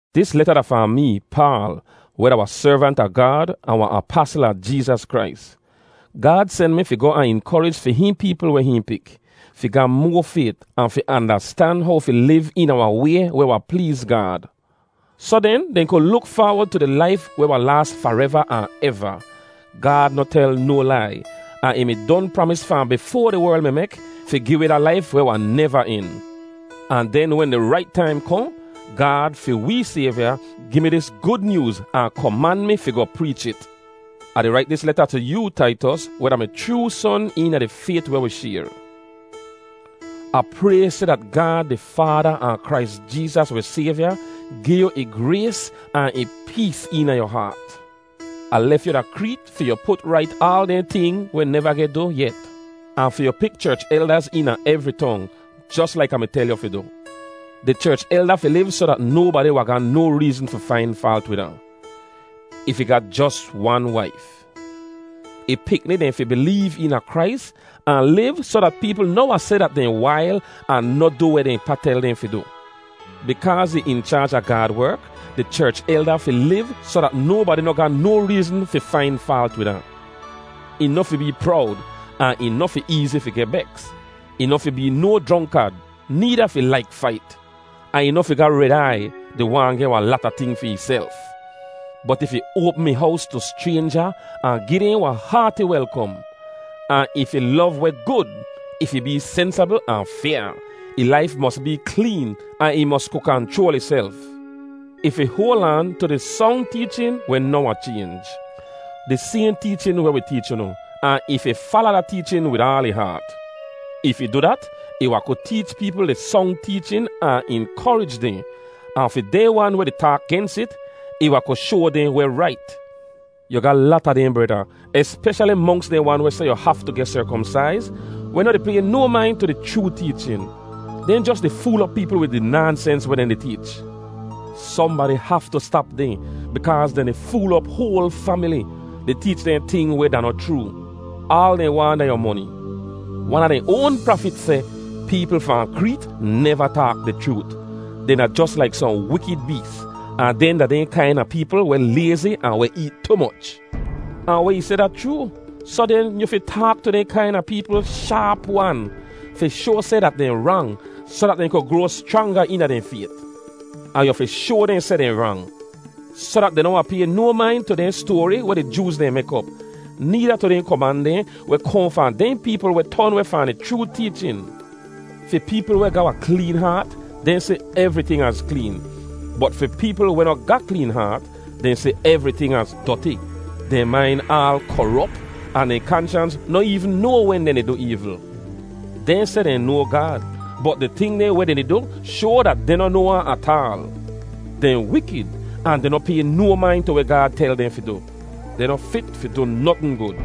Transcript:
Dis leta da fahn mee, Paal, weh da wahn servant a Gaad ahn wahn apasl a Jeezas Krais. Gaad sen mi fi goh ahn inkorij fi hihn peepl weh hihn pik, fi ga moa fayt ahn fi andastan how fi liv eena wahn way weh wahn pleez Gaad. Soh den, dehn kud luk faawod tu di laif weh wahn laas fareva ahn eva. Gaad noh tel no lai, ahn ih mi don pramis fahn bifoa di werl mi mek, fi gi wi da laif weh wahn neva en. Ahn den wen di rait taim kohn, Gaad, fi wee Sayvya, gi mi dis Gud Nyooz ahn koman mi fi goh preech it. Ah di rait dis leta tu yoo, Taitos, weh da mi chroo son eena di fayt weh wi shayr. Ah pray seh dat Gaad di Faada ahn Krais Jeezas wi Sayvya gi yu ih grays ahn ih pees eena yu haat. Ah lef yu da Kreet fi yu put rait aal dehn ting weh neva geh du yet, ahn fi yu pik cherch eldaz eena evri tong, jos laik Ah mi tel yu fi du. Di cherch elda fi liv soh dat nobadi wahn ga no reezn fi fain faalt wid ahn. Ih fi ga jos wan waif. Ih pikni dehn fi bileev eena Krais ahn liv soh dat peepl noh wahn seh dat dehn wail ahn noh du weh dehn pa tel dehn fi du. Bikaaz ih in chaaj a Gaad werk, di cherch elda fi liv soh dat nobadi noh ga no reezn fi fain faalt wid ahn. Ih noh fi bee prowd ahn ih noh fi eezi fi geh beks. Ih noh fi bee no jronkad, needa fi laik fait. Ahn ih noh fi ga red aiy, di waahn geh wahn lata ting fi ihself. Bot ih fi oapm ih hows tu schraynja ahn gi dehn wahn haati welkom. Ahn ih fi lov weh gud. Ih fi bee sensabl ahn fyaa; ih laif mos bee kleen, ahn ih mos ku kanchroal ihself. Ih fi hoal aan tu di song teechin weh noh wahn chaynj, di sayhn teechin weh wi teech unu, ahn ih fi fala da teechin wid aal ih haat. If ih du dat, ih wahn ku teech peepl di song teechin ahn inkorij dehn. Ahn fi dehn wan weh di taak gens it, ih wahn ku shoa dehn weh rait. Yu ga lata dehn breda, espeshali monks dehn wan weh seh yu haftu geh serkomsaiz, weh noh di pay no main tu di chroo teechin. Dehn jos di fool op peepl wid di naansens weh dehn di teech. Sohnbadi haftu stap dehn bikaaz dehn di fool op hoal famili, di teech dehn ting weh da noh chroo. Aal dehn waahn da yu moni. Wan a dehn oan prafit seh, “Peepl fahn Kreet neva taak di chroot. Dehn da jos laik sohn wikid bees, ahn dehn da dehn kaina peepl weh layzi ahn weh eet tu moch.” Ahn weh ih seh da chroo. Soh den, yu fi taak tu dehn kaina peepl shaap-wan, fi shoa seh dat dehn rang soh dat dehn ku groa schranga eena dehn fayt. Ahn yu fi shoa dehn seh dehn rang, soh dat dehn noh wahn pay no main tu dehn stoari weh di Jooz dehn mek op; needa tu dehn koman dehn weh kohn fahn dehn peepl weh ton weh fahn di chroo teechin. Fi peepl weh ga wahn kleen haat, dehn si evriting az kleen, bot fi peepl weh noh ga kleen haat, dehn si evriting az doti. Dehn main aal korop ahn dehn kanshans noh eevn noa wen dehn di du eevl. Dehn seh dehn noa Gaad, bot di ting dehn weh dehn di du shoa dat dehn noh noa ahn ataal. Dehn wikid, ahn dehn noh pay no main tu weh Gaad tel dehn fi du. Dehn noh fit fi du notn gud.